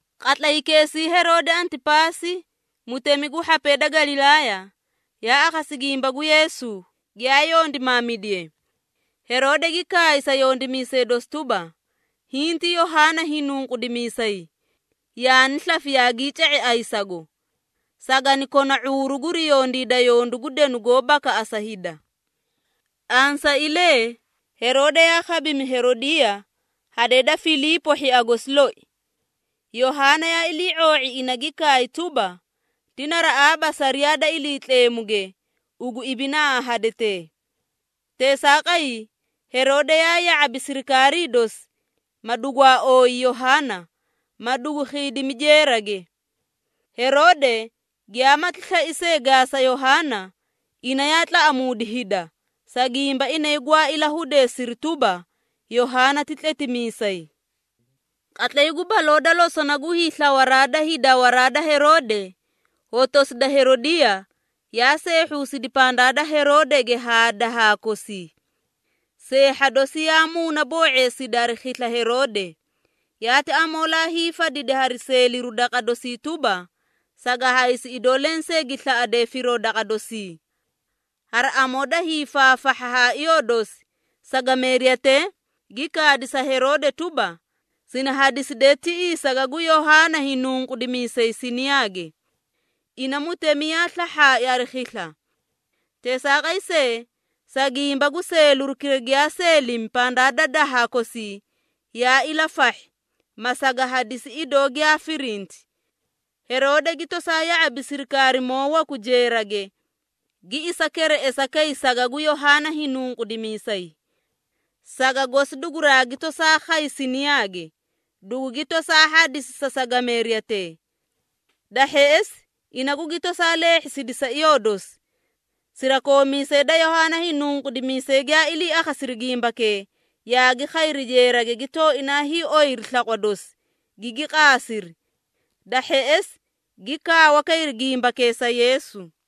Qatlaykeesii Heroode Antipaasi, mutemi gu hhapee da Galilaaya, yaa akhasi gimba gu Yeesu, giyaa yondimaamidiye. Heroode gi kaay sa yondimiisee dosi tuba, “Hiĩ ti Yohaana Hiinunqudimiisay, yaani slafi yaagii ca⁄i ayisago! Sagani kona ⁄uuru guri yondiida yondu gu denu goó bakaꞌasa hida.” Ansailee, Heroode yaa khabimi Heroodiiya, hadee da Filiipo hhia gosi loi. Yohaana yaa ilii⁄oo⁄i ina gi kaay tuba, “Ti naraꞌaaba sariyaa da Iliitleemuge ugu ibinaa haa hadetee!” Teesaaqay, Heroode yaa ya⁄abi sirikaarii dosi, ma dugwaa ooyi Yohaana, ma dugu khiidimi jeerage. Heroode giyaamati slai see gaasa Yohaana, ina yaa tlaꞌamuudi hida, sa gimba inay gwaa ilahudeesiri tuba, Yohaana ti tletimiisay. Qatlay gu baloo da losona gu hiislawaraa da hiidawaraa da Heroode, hotosi da Heroodiiya yaa seehhuusidi pandaa da Heroodege haa dahaa kosii. Seehha dosi yaa muunaboo⁄eesidi hari khisla Heroode, yaati amoolaa hiifadidi hari seeliru daqa dosii tuba, saga haysi idoo lensee gi slaꞌade firoo daqa dosii. Hari amoo da hiifaafahha ha iyoo dosi, sagameeriyatee gi kaadi sa Heroode tuba, “Sini hadiside tiꞌii saga gu Yohaana Hiinunqudimiisay siniyaage.” Ina mutemi yaa slahhaai hari khisla. Teesaaqay see, sa gimba gu seelirukira giyaa seelimi pandaa da dahaa kosii, yaa ilafahhi, ma saga hadisi idoo giyaa firinti. Heroode gi tosaa ya⁄abi sirikaarimoo waku jeerage, gi isa kereꞌesa kay saga gu Yohaana Hiinunqudimiisay. Saga gosi duguraagi tosaa khay siniyaage, dugugi tosaa hadisi sa sagameeriyatee. Da hheꞌesi, ina gugi tosaa leehhisidi sa iyoo dosi. Sirakoomiisee da Yohaana Hiinunqudimiisay giyaa ilii akhasiri gimbakee, yaagi khayri jeerage gi tooinaa hiioyiri slaqwa dosi, gigi qaasiri. Da hheꞌesi, gi kaawa kayri gimbakee sa Yeesu.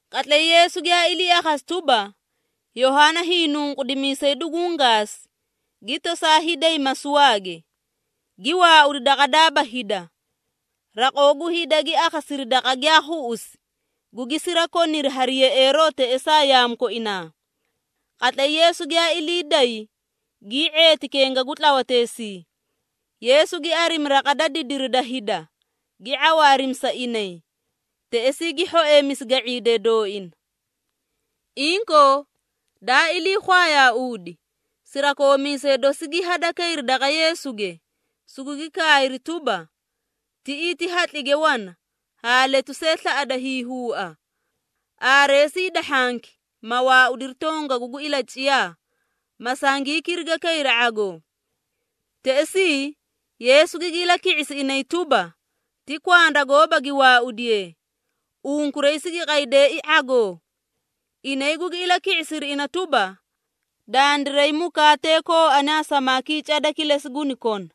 Qatlay Yeesu giyaa ilii akhasi tuba, Yohaana Hiinunqudimiisay duguũ gaasi, gi tosaa hiiday masuwaage, gi waaudi daqa daaba hida. Raqoo gu hida gi akhasiri daqa giyaa khuꞌusi, gugi sirakoniri hari yeꞌeeroo teꞌesaa yaamu koinaa. Qatlay Yeesu giyaa ilii day, gii ⁄eeti kenga gu tlawateesii. Yeesu gi arimi raqa da didiri da hida, gi ⁄awaarimi sa inay. Teꞌesii gi hhoeemisi ga⁄iidee dooina. Inkoo, daa iliikhwayauudi, sirakoomiisee dosi gi hadakayri daqa Yeesuge, sugugi kaayri tuba, “Tiꞌii ti hatlige wana haa letu see slaꞌada hiihuua. Aareesi hida hhanki, ma waaudiri tongagu gu ilaciyaa, ma sangii kiriga kayri ⁄agoo.” Teꞌesii, Yeesu gigi ilaki⁄isi inay tuba, “Ti kwanda gooba gi waaudiyee, unkuray sigi qaydeei ⁄agoo!” Inay gugi ilaki⁄isiri ina tuba, “Dandiray mukaatee kooani haa samaakii cada kilesi guni kona.”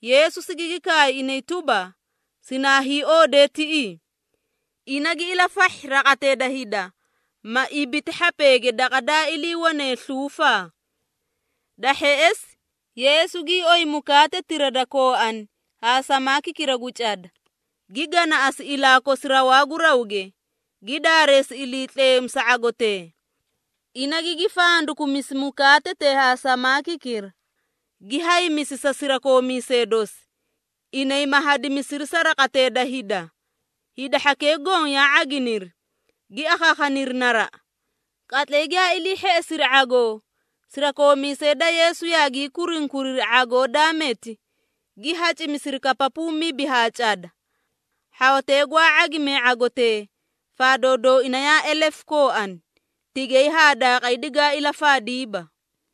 Yeesu sigigi kaay inay tuba, “Sinaa hiioodee tiꞌii.” Ina gi ilafahhi raqatee da hida, ma ibiti hhapeege daqa daa iliiwane sluufaa. Da hheꞌesi, Yeesu gii oyi mukaatetira da kooani haa samaakikira gu cada, gi ganaꞌasi ilaa kosi rawaa gu rawge, gi daareesi Iliitleemu sa ⁄agotee. Ina gigi fandakumisi mukaatetee haa samaakikira, gi haymisi sa sirakoomiisee dosi, inay ma hadimisiri sa raqatee da hida. Hida hhakee goõ yaa ⁄aginiri, gi akhaakhaniri naraꞌa. Qatlay giyaa ilii hheꞌesiri ⁄agoo, sirakoomiisee da Yeesu yaagii kurunkuriri ⁄agotira daa meti, gi hacimisiri kapapuu mibi haa cada. Hhawatee gwaa ⁄agimee ⁄agotee, faadoo dooina yaa elefu kooani, tigay haa daaqay digaa ilafaadiiba.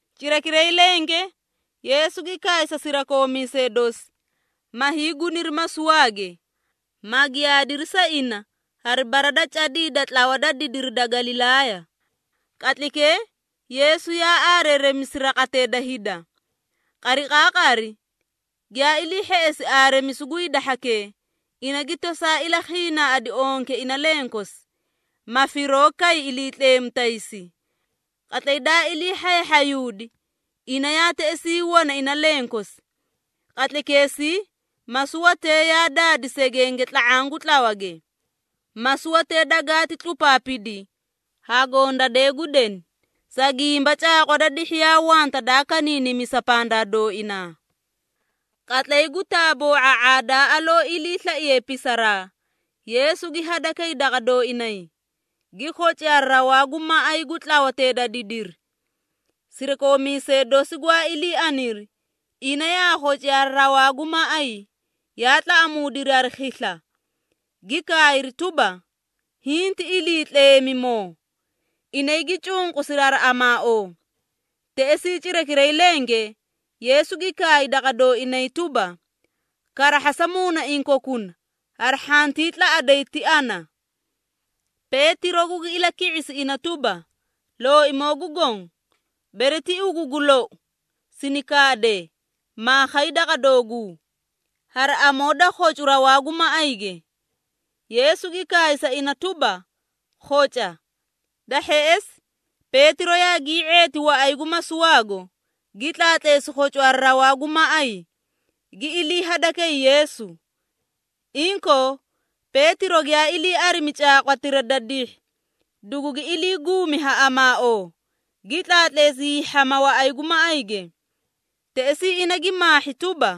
Cirakiray lenge, Yeesu gi kaay sa sirakoomiisee dosi, ma hiiguniri masuwaage, ma giyaadiri sa ina hari bara da cadii da tlawa da didiri da Galilaaya. Qatlaykee Yeesu yaa aareeremisi raqatee da hida. Qariqaaqari giyaa ilii hheꞌesi aareemisu gu hida hhakee, ina gi tosaa ilakhiinaaꞌadi onke ina lenkosi, ma firoo kay Iliitleemu taysi. Qatlay daa ilii hhayahhayuudi, ina yaa teꞌesii wana ina lenkosi. Qatlaykeesii masuwatee yaa daadi segenge tla⁄aã gu tlawage. Masuwatee dagaati tlupaapidi ha gondadee gu deni, sa gimba caaqwa da dihhi yaa wanta daa kaniinimisa pandaa dooinaa. Qatlay gu taaboo⁄a⁄aa daa aloo iliislaiye pisaraa, Yeesu gi hadakay daqa dooinay, gi khoci hari rawaa gu maꞌay gu tlawatee da didiri. Sirakoomiisee dosi gwaa ilii aniri, ina yaa khoci hari rawaa gu maꞌay, yaa tlaꞌamuudiri hari khisla, gi kaayri tuba, “Hiĩ ti iliitleemimoo!” Inay gi cunqusiri hari amaaoo. Teꞌesii cirakiray lenge Yeesu gi kaay daqa dooinay tuba, “Karahhasa muunaiĩ kokuna, hari hhantii tlaꞌaday, ti ana!” Peetiro gugi ilaki⁄isi ina tuba, “Looimoo gu Goõ, bere ti ugu gu lou, sini kaade, maa khay daqa dooguu, hari amoo da khocu rawaa gu maꞌayge.” Yeesu gi kaay sa ina tuba, “Khoca.” Da hheꞌesi, Peetiro yaagii ⁄eeti waꞌay gu masuwaago, gi tlaatleesi khocu hari rawaa gu maꞌay, gi ilii hadakay Yeesu. Inkoo, Peetiro giyaa ilii arimi caaqwatira da dihhi, dugugi ilii guumi ha amaaoo, gi tlaatleesi hiihhama waꞌay gu maꞌayge. Teꞌesii ina gi maahhi tuba,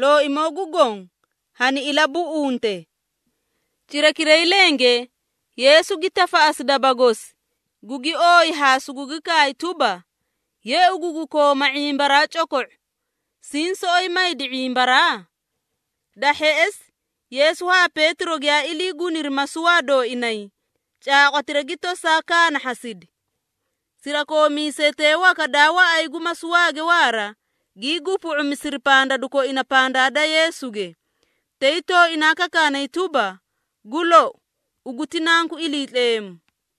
“Looimoo gu Goõ, hani ilabuꞌunte.” Cirakiray lenge, Yeesu gi tafaꞌasi daba gosi, gugi ooyi haa sugugi kaay tuba, “Ye ugu gu kooma ⁄imbaraa coko⁄u! Siĩ soꞌoyi maydi ⁄imbaraa?” Da hheꞌesi, Yeesu haa Peetiro giyaa ilii guniri masuwaa dooinay, caaqwatira gi tosaa kaanahhasidi. Sirakoomiisetee waka daa waꞌay gu masuwaage waara, gii gupu⁄umisiri pandadu koina pandaa da Yeesuge, tay tooinaa kakaanay tuba, “Gu lou, ugu ti Nanku Iliitleemu!”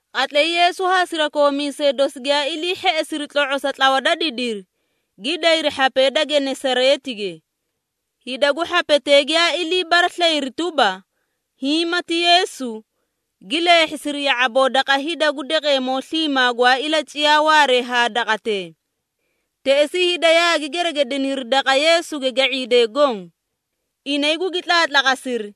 Qatlay Yeesu haa sirakoomiisee dosi giyaa ilii hheꞌesiri tlo⁄osa tlawa da didiri, gi dayri hhapee da Genesareetige. Hida gu hhapetee giyaa ilii baraslayiri tuba, hiĩ mati Yeesu, gi leehhisiri ya⁄aboo daqa hida gu daqeemoo sliimaa gwaa ilaciyaa waaree haa daqatee. Teꞌesii hida yaagi geregediniri daqa Yeesuge ga⁄iidee goõ. Inay gugi tlaatlaqasiri,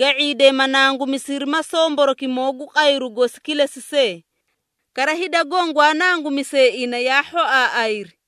ga⁄iidee ma nangumisiri ma somborokimoo gu qayru gosi kilesi see. Kara, hida goõ gwaa nangumisee ina yaa hhoaaꞌayri.